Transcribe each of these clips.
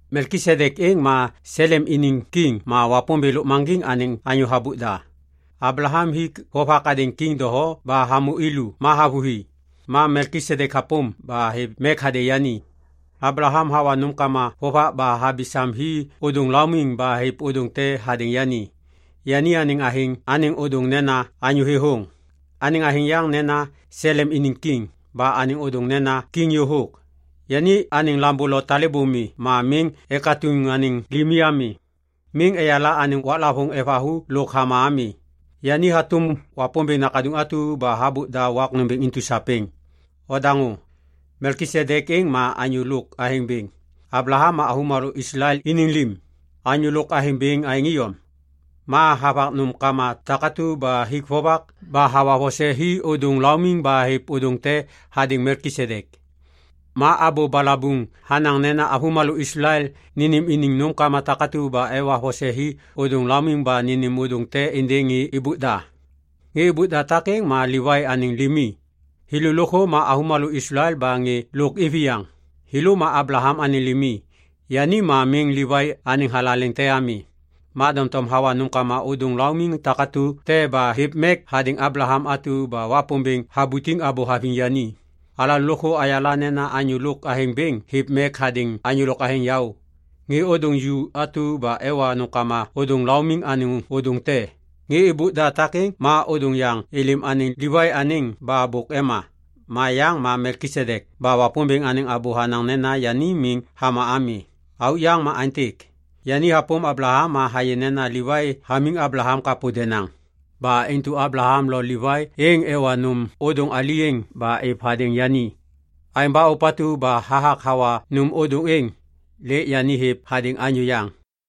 Melkisedek êŋ ma Selem iniŋ kiŋ ma Wapômbêŋ Lôkmaŋgiŋ anêŋ anyô habôk da. Ablaham hik vovak hadêŋ kiŋ doho ba hamô i lu ma havôhi. Ma Melkisedek hapôm ba hêv mek hadêŋ yani. Ablaham hawa nômkama vovak ba habi sam hi ôdôŋ laumiŋ ba hêv ôdôŋ te hadêŋ yani. Yani anêŋ athêŋ anêŋ ôdôŋ nena “Anyô Thêthôŋ”. Anêŋ athêŋ yaŋ nena “Selem iniŋ Kiŋ” ba anêŋ ôdôŋ nena “Kiŋ Yôhôk”. Yani anêŋ lambô lo talêbô mi ma miŋ ekatuŋ anêŋ limi ami. Miŋ eyala anêŋ waklavôŋ evathu lôk hama ami. Yani hatôm Wapômbêŋ nakaduŋ atu ba habôk da wak nômbêŋ intu sapêŋ. Odaŋô! Melkisedek êŋ ma anyô lôk athêŋ bêŋ. Ablaham ma avômalô Islael iniŋ lim, anyô lôk athêŋ bêŋ aêŋ iyom. Ma havak nômkama takatu ba hik vovak ba hawa vose hi ôdôŋ laumiŋ ba hêv ôdôŋ te hadêŋ Melkisedek. Ma abô balabuŋ hanaŋ nena avômalô Islael nênêm iniŋ nômkama takatu ba evak vose hi ôdôŋ laumiŋ ba nênêm ôdôŋ te êndêŋ ŋê êbôk da. Ŋê êbôk da takêŋ ma Livai anêŋ limi. Thêlô lôkthô ma avômalô Islael ba ŋê lôk iviyaŋ. Thêlô ma Ablaham anêŋ limi. Yani ma miŋ Livai anêŋ thalaleŋ te ami. Ma doŋtom hawa nômkama ôdôŋ laumiŋ takatu te ba hêv mek hadêŋ Ablaham atu ba Wapômbêŋ habutiŋ abô haviŋ yani. Alalô lôkthô ayala nena anyô lôk athêŋ bêŋ hêv mek hadêŋ anyô lôk athêŋ yaô. Ŋê ôdôŋ ju atu ba ewa nômkama ôdôŋ laumiŋ anêŋ ôdôŋ te. Ŋê êbôk da takêŋ ma ôdôŋ yaŋ êlêm anêŋ Livai anêŋ ba bôk ema. Ma yaŋ ma Melkisedek ba Wapômbêŋ anêŋ abô hanaŋ nena yani miŋ hama ami. Auk yaŋ ma aêntêk. Yani hapôm Ablaham ma hayê nena Livai hamiŋ Ablaham kapô denaŋ. Ba intu Ablaham lo Livai êŋ ewa nôm ôdôŋ ali êŋ ba êv hadêŋ yani. Aêŋ ba ôpatu ba hathak hawa nôm ôdôŋ êŋ, lêk yani hêv hadêŋ anyô yaŋ.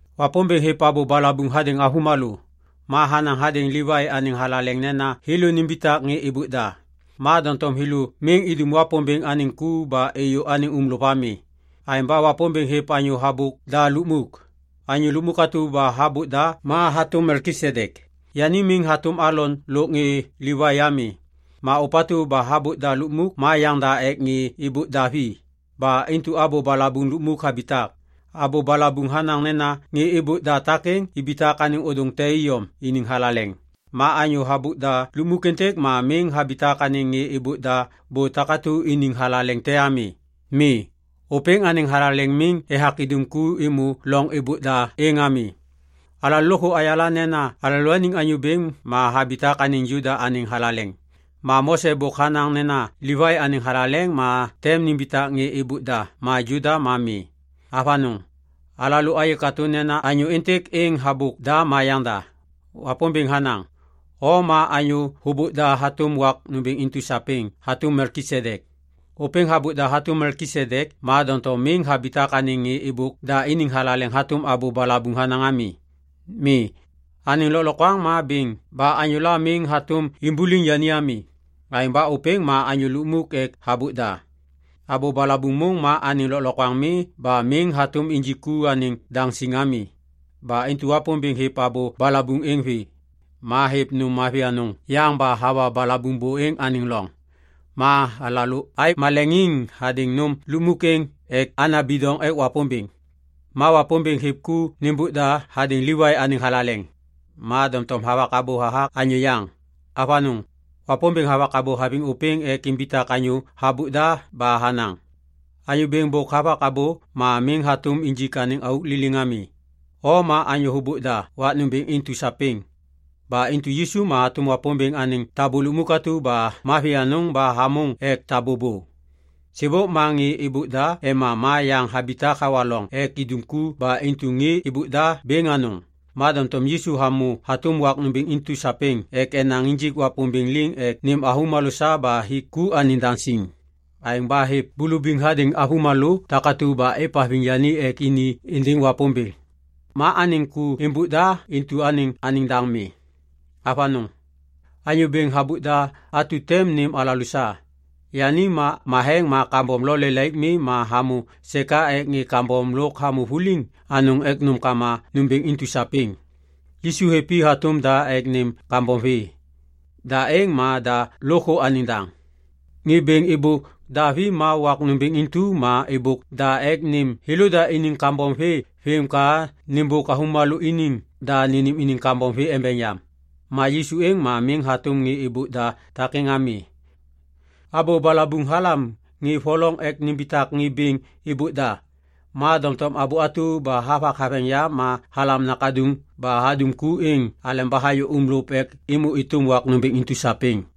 Wapômbêŋ hêv abô balabuŋ hadêŋ avômalô. Ma hanaŋ hadêŋ Livai anêŋ thalaleŋ nena thêlô nimbitak ŋê êbôk da. Ma doŋtom thêlô miŋ idum Wapômbêŋ anêŋ ku ba êyô anêŋ uŋlôv ami. Aêŋ ba Wapômbêŋ hêv anyô habôk da lukmuk. Anyô lukmuk atu ba habôk da ma hatôm Melkisedek. Yani miŋ hatôm Alon lôk ŋê Livai ami. Ma ôpatu ba habôk da lukmuk ma yaŋda ek ŋê êbôk da vi. Ba intu abô balabuŋ lukmuk habitak. Abô balabuŋ hanaŋ nena ŋê êbôk da takêŋ ibitak anêŋ ôdôŋ te iyom iniŋ thalaleŋ. Ma anyô habôk da lukmuk êntêk ma miŋ habitak anêŋ ŋê êbôk da bô takatu iniŋ thalaleŋ te ami. Mi. Ôpêŋ anêŋ thalaleŋ miŋ ethak idum ku êmô loŋ êbôk da êŋ ami. Alalô lôkthô ayala nena alalôaniŋ Anyô Bêŋ ma habitak anêŋ Juda anêŋ thalaleŋ. Ma Mose bôk hanaŋ nena Livai anêŋ thalaleŋ ma tem nimbitak ŋê êbôk da ma Juda ma mi. Avanôŋ! Alalô ayê katô nena anyô êntêk êŋ habôk da ma yaŋda. Wapômbêŋ hanaŋ, “O ma anyô hôbôk da hatôm wak nômbêŋ intu sapêŋ hatôm Melkisedek.” Ôpêŋ habôk da hatôm Melkisedek ma doŋtom miŋ habitak anêŋ ŋê êbôk da iniŋ thalaleŋ hatôm abô balabuŋ hanaŋ ami. Mi. Anêŋ lôklokwaŋ ma bêŋ ba anyôla miŋ hatôm imbuliŋ yani ami. Aêŋ ba ôpêŋ ma anyô lukmuk ek habôk da. Abô balabuŋ môŋ ma anêŋ lôkliŋyak mi ba miŋ hatôm injik ku anêŋ daŋ siŋ ami. Ba intu Wapômbêŋ hêv abô balabuŋ êŋ vê. Ma hêv nôm mavi anôŋ yaŋ ba hawa balabuŋ bô êŋ anêŋ loŋ. Ma alalô aêv maleŋiŋ hadêŋ nôm lukmuk êŋ ek ana bidoŋ ek Wapômbêŋ. Ma Wapômbêŋ hêv ku nêmbôk da hadêŋ Livai anêŋ thalaleŋ. Ma doŋtom havak abô hathak anyô yaŋ. Avanôŋ! Wapômbêŋ havak abô haviŋ ôpêŋ ek imbitak anyô habôk da ba hanaŋ, “Anyô Bêŋ bôk havak abô ma miŋ hatôm injik anêŋ auk liliŋ ami, ‘O ma anyô hôbôk da wak nômbêŋ intu sapêŋ.’” Ba intu Yisu ma hatôm Wapômbêŋ anêŋ tabô lukmuk atu ba mavi anôŋ ba hamôŋ ek tabô bô. Sêbôk ma ŋê êbôk da ema ma yaŋ habitak hawa loŋ ek indum ku ba intu ŋê êbôk da bêŋ anôŋ. Ma doŋtom Yisu hamô hatôm wak nômbêŋ intu sapêŋ ek enaŋ injik Wapômbêŋ liŋ ek nêm avômalô sa ba hik ku anêŋ daŋ siŋ. Aêŋ ba hêv bulubiŋ hadêŋ avômalô takatu ba êvhaviŋ yani ek ini êndêŋ Wapômbêŋ. Ma anêŋ ku êmbôk da intu anêŋ daŋ mi. Avanôŋ. Anyô bêŋ habôk da atu tem nêm alalô sa. Yani ma matheŋ ma kambom lo lelaik mi ma hamô seka ek ŋê kambom lôk hamô vuliŋ anôŋ ek nômkama nômbêŋ intu sapêŋ. Yisu hêv i hatôm da ek nêm kambom vê. Da êŋ ma da lôkthô anêŋ daŋ. Ŋê bêŋ êbôk da vi ma wak nômbêŋ intu ma êbôk da ek nêm thêlôda iniŋ kambom vê vêm ka nêmbôk avômalô iniŋ da nênêm iniŋ kambom vê embeŋ yam. Ma Yisu êŋ ma miŋ hatôm ŋê êbôk da takêŋ ami. Abô balabuŋ halam ŋê voloŋ ek nimbitak ŋê bêŋ êbôk da. Ma doŋtom abô atu ba havak haveŋ yam ma halam nakaduŋ ba hadum ku êŋ aleba hayô uŋlôv ek êmô êtôm wak nômbêŋ intu sapêŋ.